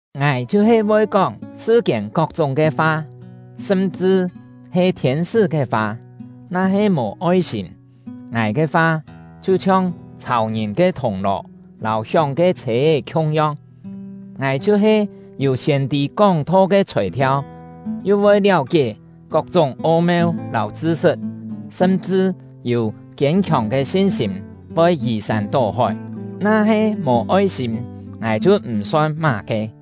Ngài chhiu-he voi kóng sṳ-kiên kok-chúng ke fa, sṳm-chṳ he thiên-sṳ́ ke fa, na-he mò oi-sîm, ngài ke fa chhiu-chhiong chhàu ngìn ke thùng-lò lâu hióng ke chhê-é khiung-yong. Ngài chhiu-he yû siên-tî kóng-tho ke chhòi-thiau, yu voi liáu-kié kok-chúng o-meu lâu chṳ-sṳt, sṳm-chṳ yû kiên-khiòng ke sin-sîm voi yì-sân tó-hói, na-he mò oi-sîm, ngài chhiu m̀-son má-ke.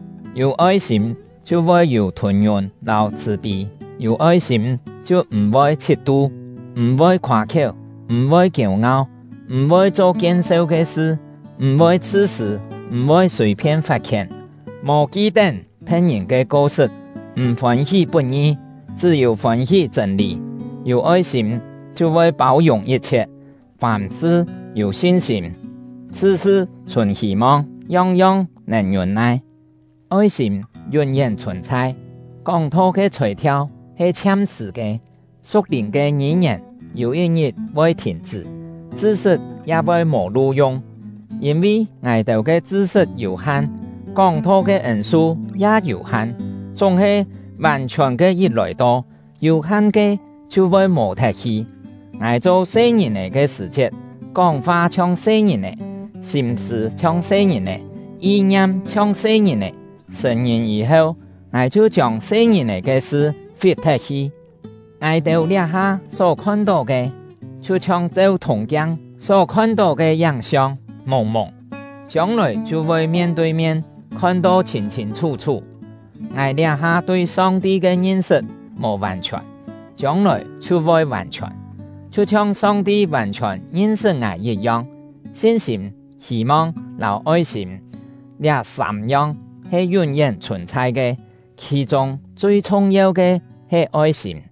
Yû oi-sîm chhiu voi yû thûn-ngiûn lâu chhṳ̀-pî; yû oi-sîm chhiu m̀-voi chhit-tu, m̀-voi khoâ-khiéu, m̀-voi kiêu-ngau, m̀-voi cho kien-seu ke sṳ, m̀-voi chhṳ-sṳ̂, m̀-voi sùi-phien fat-khién, mò ki-tén phe̍t-ngìn ke ko-sṳt, m̀ fôn-hí put-ngi, chṳ́-yû fôn-hí chṳ̂n-lî. Yû oi-sîm chhiu voi pâu-yùng yit-chhiet, fàm-sṳ yû sin-sîm, sṳ-sṳ chhùn hî-mong, yong-yong nèn ngiûn-nai. Oi-sîm yún-yén chhùn-chhai. Kóng-tho ke chhòi-thiau he chhiam-sṳ̀ ke; su̍k-lìn ke ngî-ngièn yû yit-ngit voi thìn-chṳ́; chṳ-sṳt ya voi mò lu-yung. Yîn-vi ngài-têu ke chṳ-sṳt yû-han, kóng-tho ke ên-su ya yû-han; chúng-he, vàn-chhiòn ke yit lòi-to, yû-han ke chhiu voi mò-thet hi. Ngài cho se-ngìn-è ke sṳ̀-chiet, kóng-fa chhiong se-ngìn-è, sîm-sṳ̂ chhiong se-ngìn-è, yi-ngiam chhiong se-ngìn-è; sṳ̀n-ngìn yî-heu, ngài chhiu chiông se-ngìn-è ke sṳ fit-thet-hi. Ngài-têu liá-ha só khon-tó ke, chhiu chhiong cheu thùng-kiang só khon-tó ke yáng-siong, mùng-mùng; chiông-lòi chhiu voi mien tui mien khon-to chhîn-chhîn chhú-chhú. Ngài liá-ha tui Song-ti ke ngin-sṳt mò vàn-chhiòn; chiông-lòi chhiu voi vàn-chhiòn, chhiu chhiong Song-ti vàn-chhiòn ngin-sṳt ngài yit-yong. Sin-sîm, hî-mong, lâu oi-sîm, liá sâm-yong he yún-yén chhùn-chhai ke; khì-chûng chui chhung-yeu ke he oi-sîm.